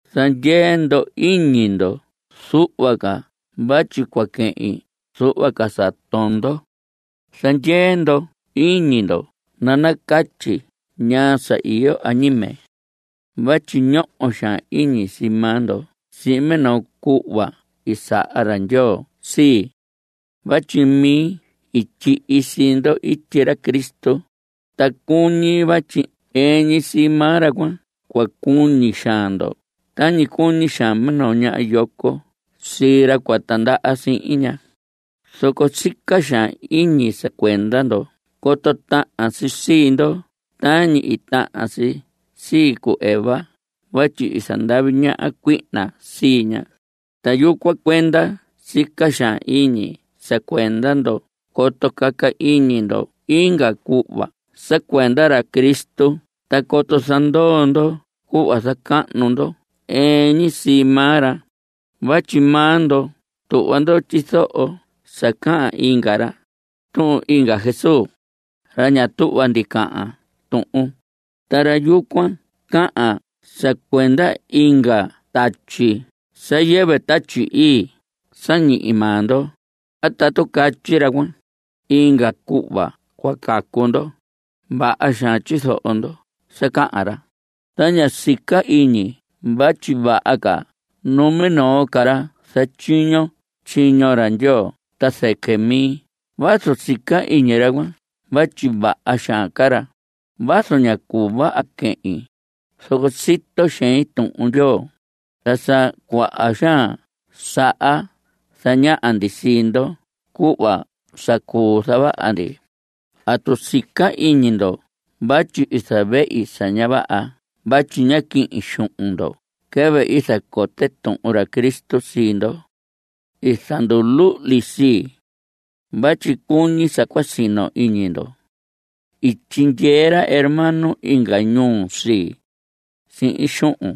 Zandyee ndo iñi ndo zuhva ca vatyi cua quehin zuhva ca sa tondo. Zandyee ndo iñi ndo nanacatyi ñaa sa iyo añime. Vatyi ñoho xaan iñi sii maa ndo sihin minoo cuhva i saha ra Ndyoo sii, vatyi mi i tyihi sii ndo ityi ra Cristo, ta cuñi vatyi ɨɨn ñi sii maa ra cuan cua cuñi xaan ndo tañi cuñi xaan minoo ñaha yoco sii ra cua tandaha sihin ña. Zoco sica xaan iñi sa cuenda ndo coto tahan si sii ndo tañi i tahan si sii cu Eva vatyi i zandavi ñaha cuihna sii ña. Ta yucuan cuenda sica xaan iñi sa cuenda ndo coto caca iñi ndo inga cuhva sa cuenda ra Cristo ta coto zandoo ndo cuhva sa zacahnu ndo ɨɨn ñi sii maa ra. Vatyi maa ndo tuhva ndo tyizoho sa cahan inga ra, tuhun inga Jesús, ra ña tuhva ndi cahan tuhun. Ta ra yucuan cahan sa cuenda inga tatyi, sa yɨvɨ Tatyi Ii sa ñihi maa ndo. A tatu catyi ra cuan, inga cuhva cua cacu ndo, vaha xaan tyizoho ndo sa cahan ra. Ta ña sica iñi vatyi vaha ca numinoo ca ra zatyiño tyiño ra Ndyoo ta zɨquɨ mi vazu sica iñi ra cuan vatyi vaha xaan ca ra. Vazu ña cuu vaha quehin, zoco sito xein Tuhun Ndyoo. Ta sa cuaha xaan saha zañaha ndi sii ndo cuhva sa cuu zavaha ndi. ¿Atu sica iñi ndo vatyi i zavehi sa ña vaha vatyi ñá quihin xuhun ndo quɨvɨ i zacote tuhun ra Cristo sii ndo? I zanduluhli sii, vatyi cuñi sa cua sino iñi ndo. I tyindyee ra hermano inga ñuu sii, sihin xuhun.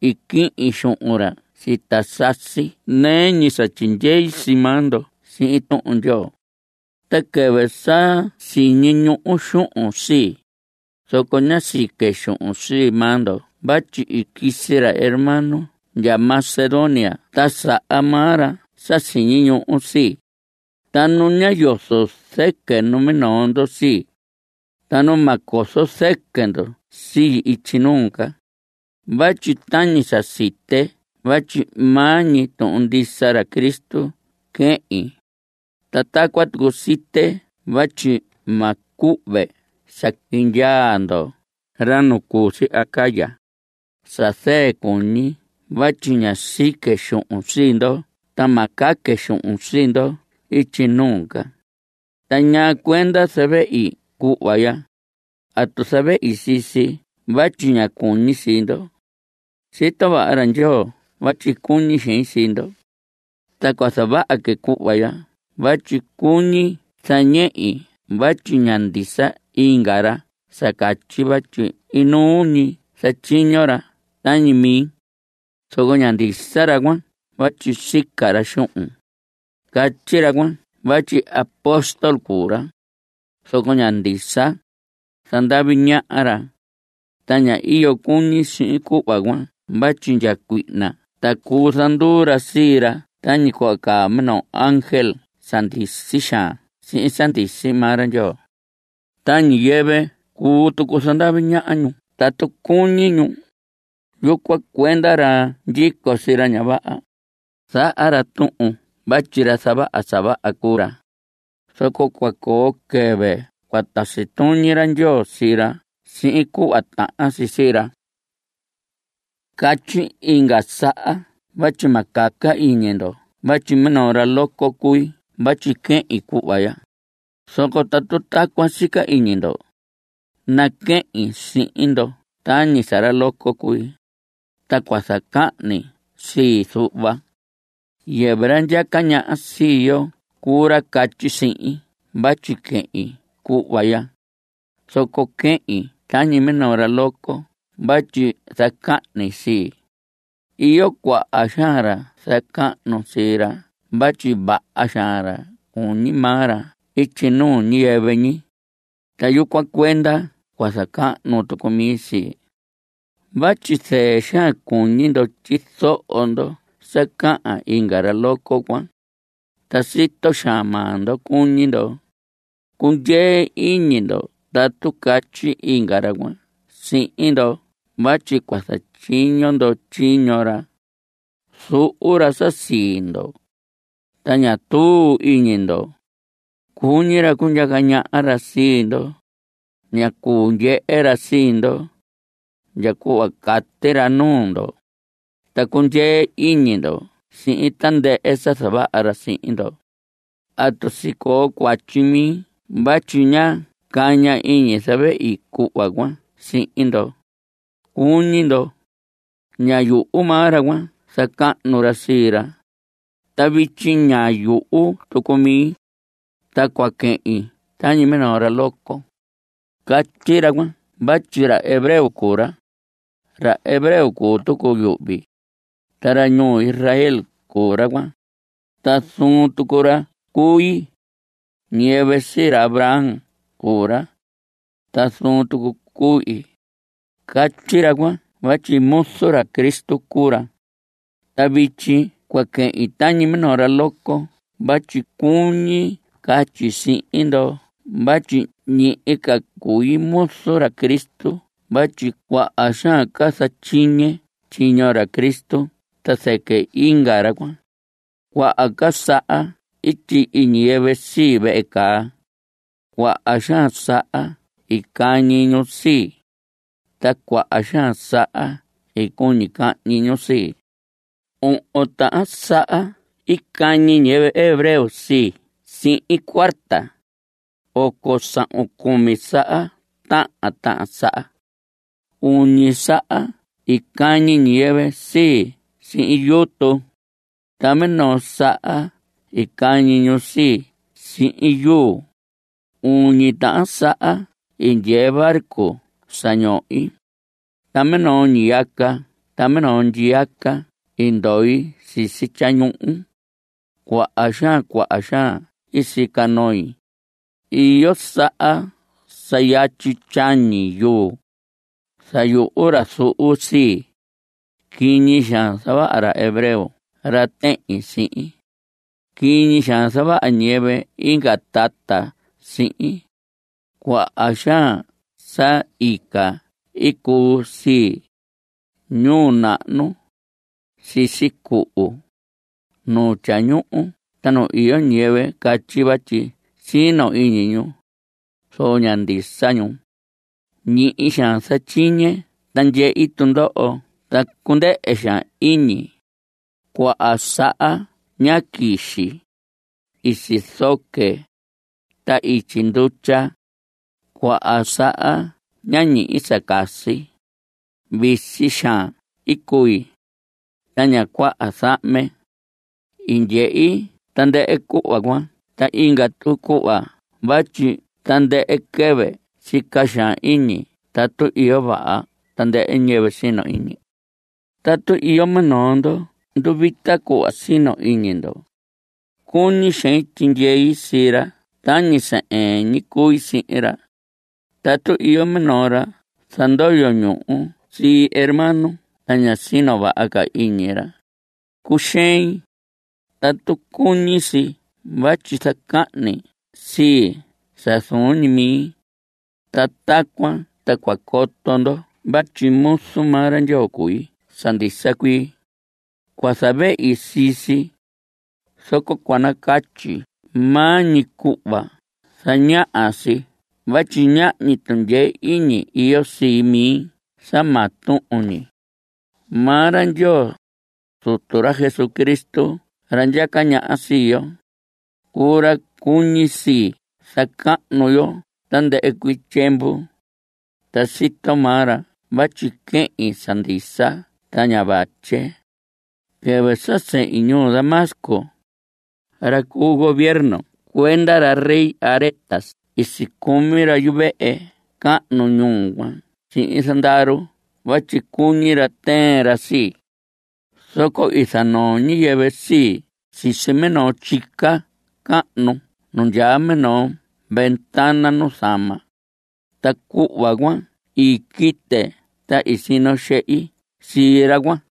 I quihin xuhun ra sita sasi nɨɨ ñi sa tyindyei sii maa ndo sihin Tuhun Ndyoo. Ta quɨvɨ sa siñi ñuhu xuhun sii, zoco ñá sique xuhun sii maa ndo vatyi i quisi ra hermano ndya Macedonia ta saha maa ra sa siñi ñuhu sii. Ta nu ñá yozo zɨquɨ numinoo ndo sii. Ta nu ma cozo zɨquɨ ndo sii ityi nuu ca. Vatyi tañi sa site vatyi maa ñi tuhun ndisa ra Cristo quehin, ta tacuan tucu site vatyi ma cuhve sa quindyaa ndoho, ra nu cu si Acaya, sa zɨɨ cuñi vatyi ñá sique xuhun sii ndo ta ma caque xuhun sii ndo ityi nuu ca. ¿Ta ñaa cuenda zavehi cuhva ya? ¿Atu zavehi sii si vatyi ña cuñi sii ndo? Sito vaha ra Ndyoo vatyi cuñi xein sii ndo. Ta cua zavaha que cuhva ya vatyi cuñi zañehi vatyi ña ndisa inga ra sa catyi vatyi inuu ñi zatyiño ra tañi mi. Zoco ña ndisa ra cuan vatyi sica ra xuhun. Catyi ra cuan vatyi apóstol cuu ra, zoco ña ndisa. Zandavi ñaha ra. Ta ña iyo cuñi sihin cuhva cuan vatyi ndya cuihna ta cuu zanduu ra sii ra tañi cuhva caa minoo ángel sa ndisi xaan sihin sa ndisi maa ra Ndyoo. Ta ñiyɨvɨ cuu tucu zandavi ñaha ñu tatu cuñi ñu. Yucuan cuenda ra ndyico sii ra ña vaha, zaha ra tuhun vatyi ra zavaha sa vaha cuu ra. Zoco cua coo quɨvɨ cua tasi tuñi ra Ndyoo sii ra sihin cuhva tahan si sii ra. Catyi inga saha vatyi ma caca iñi ndo vatyi minoo ra loco cui vatyi quehin cuhva ya. Zoco tatu tacuan sica iñi ndo, naquehin sihin ndo tañi sa ra loco cui. Ta cua zacahni sii zuhva. Yɨvɨ ra ndyaca ñaha sii yo cuu ra catyi sihin vatyi quehin cuhva ya, zoco quehin tañi minoo ra loco vatyi zacahni sii. Iyo cuaha xaan ra zacahnu sii ra vatyi vaha xaan ra cuñi maa ra ityi nuu ñiyɨvɨ ñi. Ta yucuan cuenda cua zacahnu tucu mi sii. Vatyi zɨɨ xaan cuñi ndo tyizoho ndo sa cahan inga ra loco cuan, ta sito xaan maa ndo cuñi ndo. Cundyee iñi ndo tatu catyi inga ra cuan sihin ndo vatyi cua zatyiño ndo tyiño ra. Zuhu ra sa sii ndo, ta ña tuu iñi ndo. Cuñi ra cundyaca ñaha ra sii ndo. Ña cuu ndyehe ra sii ndo, ndya cuhva cati ra nuu ndo, ta cundyee iñi ndo sihin tandɨhɨ sa zavaha ra sihin ndo. ¿Atu sicoo cuatyi mi vatyi ñá caña iñi zavehi cuhva cuan sihin ndo, cuñi ndo? Ña yuhu maa ra cuan zacahnu ra sii ra, ta vityi ña yuhu tucu mi. Ta cua quehin tañi minoo ra loco. Catyi ra cuan vatyi ra hebreo cuu ra. Ra hebreo cuu tucu yuhvi. Ta ra ñuu Israel cuu ra cuan. Ta zuun tucu ra cuu ii. Ñiyɨvɨ sii ra Abraham cuu ra, ta zuun tucu cuu ii. Catyi ra cuan vatyi muzu ra Cristo cuu ra. Ta vityi cua quehin tañi minoo ra loco vatyi cuñi catyi sihin ndo vatyi ñihi ca cui muzu ra Cristo vatyi cuaha xaan ca zatyiñe tyiño ra Cristo ta zɨquɨ inga ra cuan. Cuaha ca saha i tyihi ñiyɨvɨ sii, vehe caa. Cuaha xaan saha i cañi ñu sii. Ta cuaha xaan saha i cuñi cahñi ñu sii. Ohon tahan saha i cañi ñiyɨvɨ hebreo sii sihin cuarta. Oco sahun cumi saha tahan tahan saha. Uñi saha i cañi ñiyɨvɨ sii sihin yutu, ta minoo saha i cañi ñu sii sihin yuu. Uñi tahan saha i ndyee barco sa ñohi, ta minoo ñiyaca ta minoo ndyiyaca i ndoi sisi tyañuhu. Cuaha xaan, cuaha xaan sica noi. Iyo saha sa yatyi tyañi yuu. Zayuhu ra zuhu sii. Quiñi xaan zavaha ra hebreo ra tehin sihin. Quiñi xaan zavaha ñiyɨvɨ inga tata sihin. Cuaha xaan sa ica i cuu sii, ñuu nahnu, sisi cuhu, nu tyañuhu ta nu iyo ñiyɨvɨ catyi vatyi sino iñi ñu, zoco ña ndisa ñu. Ñihi xaan zatyiñe ta ndyehi tundoho ta cundɨhɨ xaan iñi. Cuaha saha ñá quixi. I sizoque, ta ityi ndutya. Cuaha saha ñá ñihi sa casi. Visi xaan i cui, ta ña cuaha zahme. I ndyehi tandɨhɨ cuhva cuan ta inga tucu cuhva vatyi tandɨhɨ quɨvɨ sica xaan iñi tatu iyo vaha tandɨhɨ ñiyɨvɨ sino iñi. Tatu iyo minoo ndo nduvita cuhva sino iñi ndo, cuñi xein tyindyei sii ra tañi sa ɨɨn ñi cui sihin ra. Tatu iyo minoo ra zandoyo ñuhu sii hermano ta ña sino vaha ca iñi ra, cuxein. Tatu cuñi si vatyi zacahni sii sa zuun ñi mi (ta tacuan ta cua coto ndo vatyi muzu maa ra Ndyoo cui sa ndisa cuii; cua zavehi sii si) zoco cua nacatyi maa ñi cuhva zañaha si vatyi ñahñi tundyee iñi iyo sii mi sa maa tuhun ñi. Maa ra Ndyoo, Zutu ra Jesucristo ra ndyaca ñaha sii yo, cuu ra cuñi si zacahnu yo tandɨhɨ cuii tyiemvu. Ta sito maa ra vatyi quehin sa ndisa ta ña vatye. Quɨvɨ sa sehin ñuu Damasco, ra cu gobierno cuenda ra rey Aretas i sicumi ra yuvehe cahnu ñuu cuan sihin zandaru vatyi cuñi ra tɨɨn ra sii. Zoco i zanoo ñiyɨvɨ sii sisi minoo tyica cahnu nu ndyaa minoo ventana nuzama cuan, ta cuhva cuan i quite ta i sino xehi sii ra cuan.